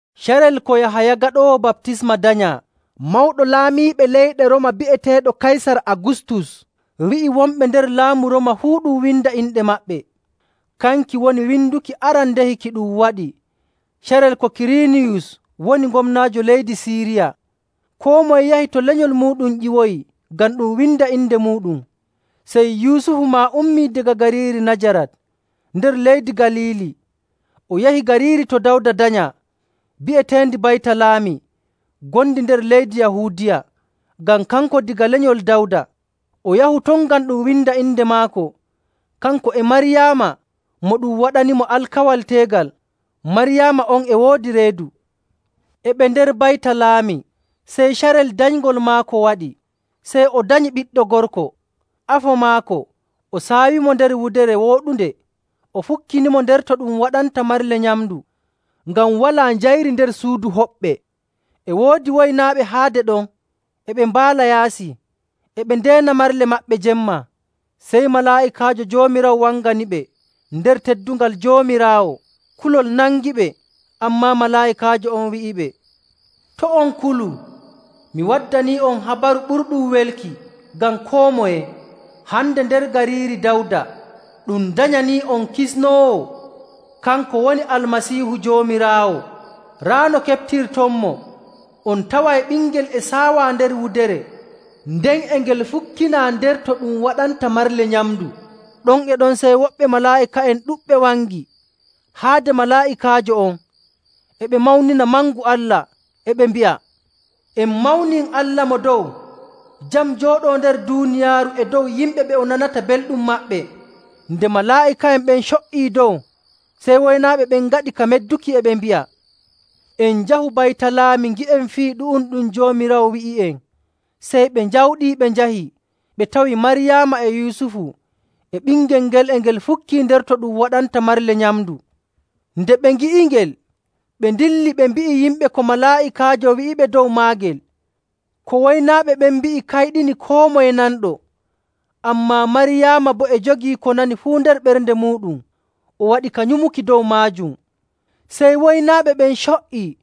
Carel ko Yahaya Gaɗoowo Baptisma danyaa, Mawɗo Laamiiɓe leyɗe Rooma bi'eteeɗo Kaysar Agustus wi'i wonɓe nder laamu Rooma fuu ɗum winda inɗe maɓɓe. Kanki woni winduki arandehi ki ɗum waɗi carel ko Kiriiniyus woni gomnaajo leydi Siiriya. Koo moye yahi to lenyol muuɗum ƴiwoyi ngam ɗum winda inde muuɗum. Sey Yusufu maa ummii daga gariiri Najarat nder leydi Galiili. O yahi gariiri to Dawda danyaa bi'eteendi Baytalaami ngondi nder leydi Yahuudiya, ngam kanko daga lenyol Dawda. O yahu ton ngam ɗum winda inde maako, kanko e Maryaama, mo ɗum waɗanimo alkawal teegal. Maryaama on e woodi reedu. E ɓe nder Baytalaami, sey carel danyngol maako waɗi. Sey o danyi ɓiɗɗo gorko, afo maako, o saawimo nder wudere wooɗunde, o fukkinimo nder to ɗum waɗanta marle nyamndu, ngam walaa njayri nder suudu hoɓɓe. E woodi woynaaɓe haade ɗon e ɓe mbaala yaasi, e ɓe ndeena marle maɓɓe jemma. Sey malaa'ikaajo Joomiraawo wanganiɓe nder teddungal Joomiraawo, kulol nangiɓe. Ammaa malaa'ikaajo on wi'iɓe, “To' on kulu! Mi waddanii'on habaru ɓurɗum welki ngam koo moye. Hande nder gariiri Dawda ɗum danyanii'on kisnoowo, kanko woni Almasiihu, Joomiraawo. Raa no keɓtirtonmo, on taway ɓingel e saawaa nder wudere, nden e ngel fukkinaa nder to ɗum waɗanta marle nyamndu.” Ɗon e ɗon sey woɓɓe malaa'ika'en ɗuɗɓe wangi haade malaa'ikaajo on, e ɓe mawnina mangu Allah, e ɓe mbi'a, “En mawnin Allah Mo Dow, jam jooɗoo nder duuniyaaru e dow yimɓe ɓe o nanata belɗum maɓɓe.” Nde malaa'ika'en ɓen co''ii dow, sey woynaaɓe ɓen ngaɗi ka medduki, e ɓe mbi'a, “En njahu Baytalaami ngi'en fii ɗu'um ɗum Joomiraawo wi'i'en.” Sey ɓe njawɗii, ɓe njahi, ɓe tawi Maryaama e Yusufu e ɓingel ngel e ngel fukkii nder to ɗum waɗanta marle nyamndu. Nde ɓe ngi'ingel, ɓe ndilli, ɓe mbi'i yimɓe ko malaa'ikaajo wi'iɓe dow maagel. Ko woynaaɓe ɓen mbi'i kayɗinii koo moye nanɗo. Ammaa Maryaama boo e jogii ko nani fuu nder ɓernde muuɗum, o waɗi ka nyumuki dow maajum. Sey woynaaɓe ɓen co''ii,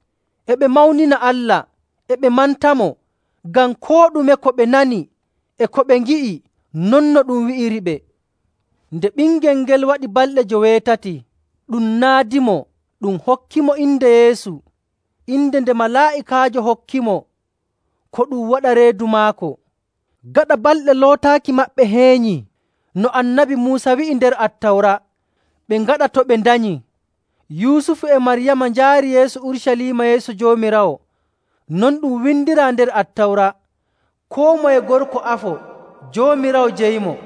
e ɓe mawnina Allah, e ɓe mantamo ngam koo ɗume ko ɓe nani e ko ɓe ngi'i, non no ɗum wi'iriɓe. Nde ɓingel ngel waɗi balɗe joweetati, ɗum naadimo ɗum hokkimo inde Yeesu, inde nde malaa'ikaajo hokkimo ko ɗum waɗa reedu maako.. Gaɗa balɗe lootaaki maɓɓe heenyi no Annabi Muusa wi'i nder Attawra ɓe ngaɗa to ɓe ndanyii, Yusufu e Maryaama njaari Yeesu Urucaliima yeeso Joomiraawo. Non ɗum windiraa nder Attawra, “Koo moye gorko afo, Joomiraawo jeyimo.”.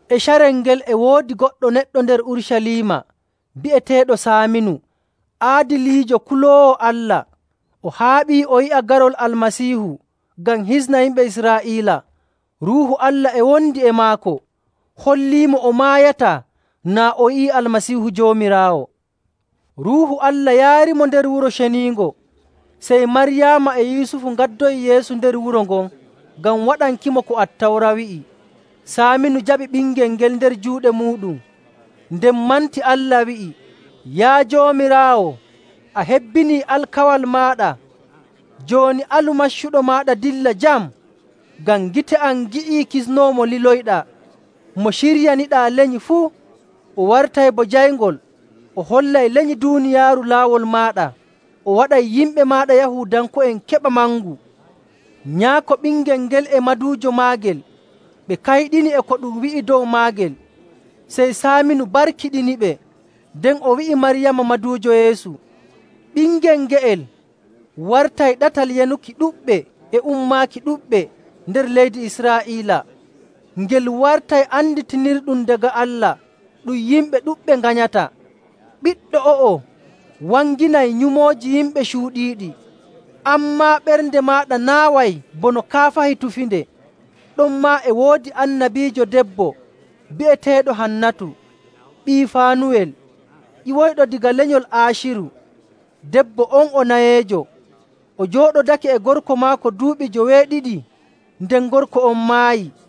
E carel ngel e woodi goɗɗo neɗɗo nder Urucaliima bi'eteeɗo Saaminu, aadiliijo, kuloowo Allah. O haaɓii o yi'a garol Almasiihu ngam hisna yimɓe Israa'iila. Ruuhu Allah e wondi e maako, holliimo o maayataa naa o yi'ii Almasiihu Joomiraawo. Ruuhu Allah yaarimo nder Wuro Ceniingo. Sey Maryaama e Yusufu ngaddoyi Yeesu nder wuro ngon ngam waɗankimo ko Attawra wi'i. Saaminu jaɓi ɓingel ngel nder juuɗe muuɗum, nden manti Allah, wi'i, “Yaa Joomiraawo, a hebbinii alkawal maaɗa. Jooni alu maccuɗo maaɗa dilla jam. Ngam gite am ngi'ii kisnoowo mo liloyɗaa, mo ciryaniɗaa lenyi fuu. O wartay bo jayngol, o hollay lenyi duuniyaaru laawol maaɗa, o waɗay yimɓe maaɗa Yahuudanko'en keɓa mangu.”. Nyaako ɓingel ngel e maduujo maagel ɓe kayɗini e ko ɗum wi'i dow maagel. Sey Saaminu barkiɗiniɓe, nden o wi'i Maryaama, maduujo Yeesu, “Ɓingel nge'el wartay ɗatal yanuki ɗuɗɓe e ummaaki ɗuɗɓe nder leydi Israa'iila. Ngel wartay anditirɗum daga Allah ɗum yimɓe ɗuɗɓe nganyata. Ɓiɗɗo o'o wanginay nyumooji yimɓe cuuɗiiɗi. An maa, ɓernde maaɗa naaway bono kaafahi tufinde.” Ɗonmaa e woodi annabiijo debbo bi'eteeɗo Hannatu ɓii Faanuwel, ƴiwoyɗo daga lenyol Aaciru. Debbo on o nayeejo, o jooɗodake e gorko maako duuɓi joweeɗiɗi, nden gorko on maayii.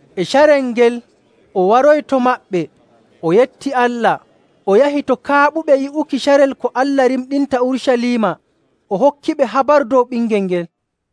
E carel ngel, o waroyi to maɓɓe, o yetti Allah, o yahi to kaaɓuɓe yi'uki carel ko Allah rimɗinta Urucaliima, o hokkiɓe habaru dow ɓingel ngel.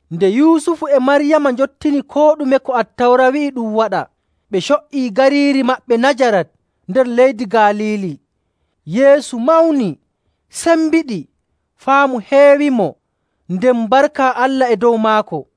Nde Yusufu e Maryaama njottini koo ɗume ko Attawra wi'i ɗum waɗa, ɓe co''ii gariiri maɓɓe Najarat nder leydi Galiili.. Yeesu mawni, sembiɗi, faamu heewimo, nden barka Allah e dow maako.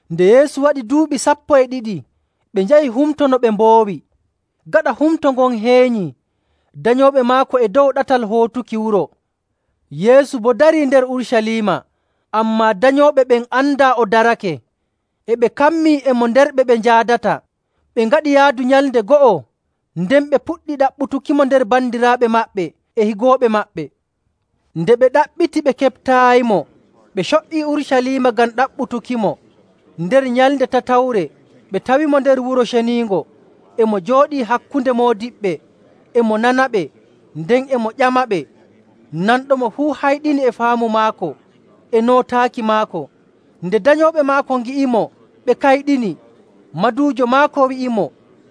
Nde Yeesu waɗi duuɓi sappo e ɗiɗi, ɓe njahi humto no ɓe mboowi. Gaɗa humto ngon heenyi, danyooɓe maako e dow ɗatal hootuki wuro, Yeesu boo darii nder Urucaliima, ammaa danyooɓe ɓen andaa o darake. E ɓe kammii e mo nder ɓe ɓe njaadata, ɓe ngaɗi yaadu nyalnde go'o, nden ɓe puɗɗi ɗaɓɓutukimo nder bandiraaɓe maɓɓe e higooɓe maɓɓe. Nde ɓe ɗaɓɓiti ɓe keɓtaayimo, ɓe co''ii Urucaliima ngam ɗaɓɓutukimo. Nder nyalnde tatawre ɓe tawimo nder Wuro Ceniingo, e mo jooɗii hakkunde moodiɓɓe, e mo nanaɓe, nden e mo ƴamaɓe. Nanɗomo fuu hayɗini e faamu maako e nootaaki maako. Nde danyooɓe maako ngi'imo, ɓe kayɗini. Maduujo maako wi'imo,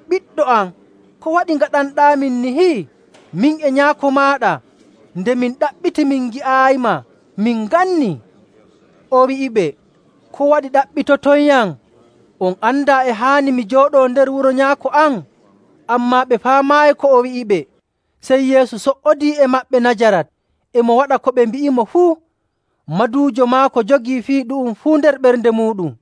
“Ɓiɗɗo am, ko waɗi ngaɗanɗaamin niini? Min e nyaako maaɗa nde min ɗaɓɓiti min ngi'aayima, min ngannii.” O wi'iɓe, “Ko waɗi ɗaɓɓitotoyyam? On andaa e haani mi jooɗoo nder wuro Nyaako am?” Ammaa ɓe faamaayi ko o wi'iɓe. Sey Yeesu so''odii e maɓɓe Najarat, e mo waɗa ko ɓe mbi'imo fuu. Maduujo maako jogii fii ɗu'um fuu nder ɓernde muuɗum.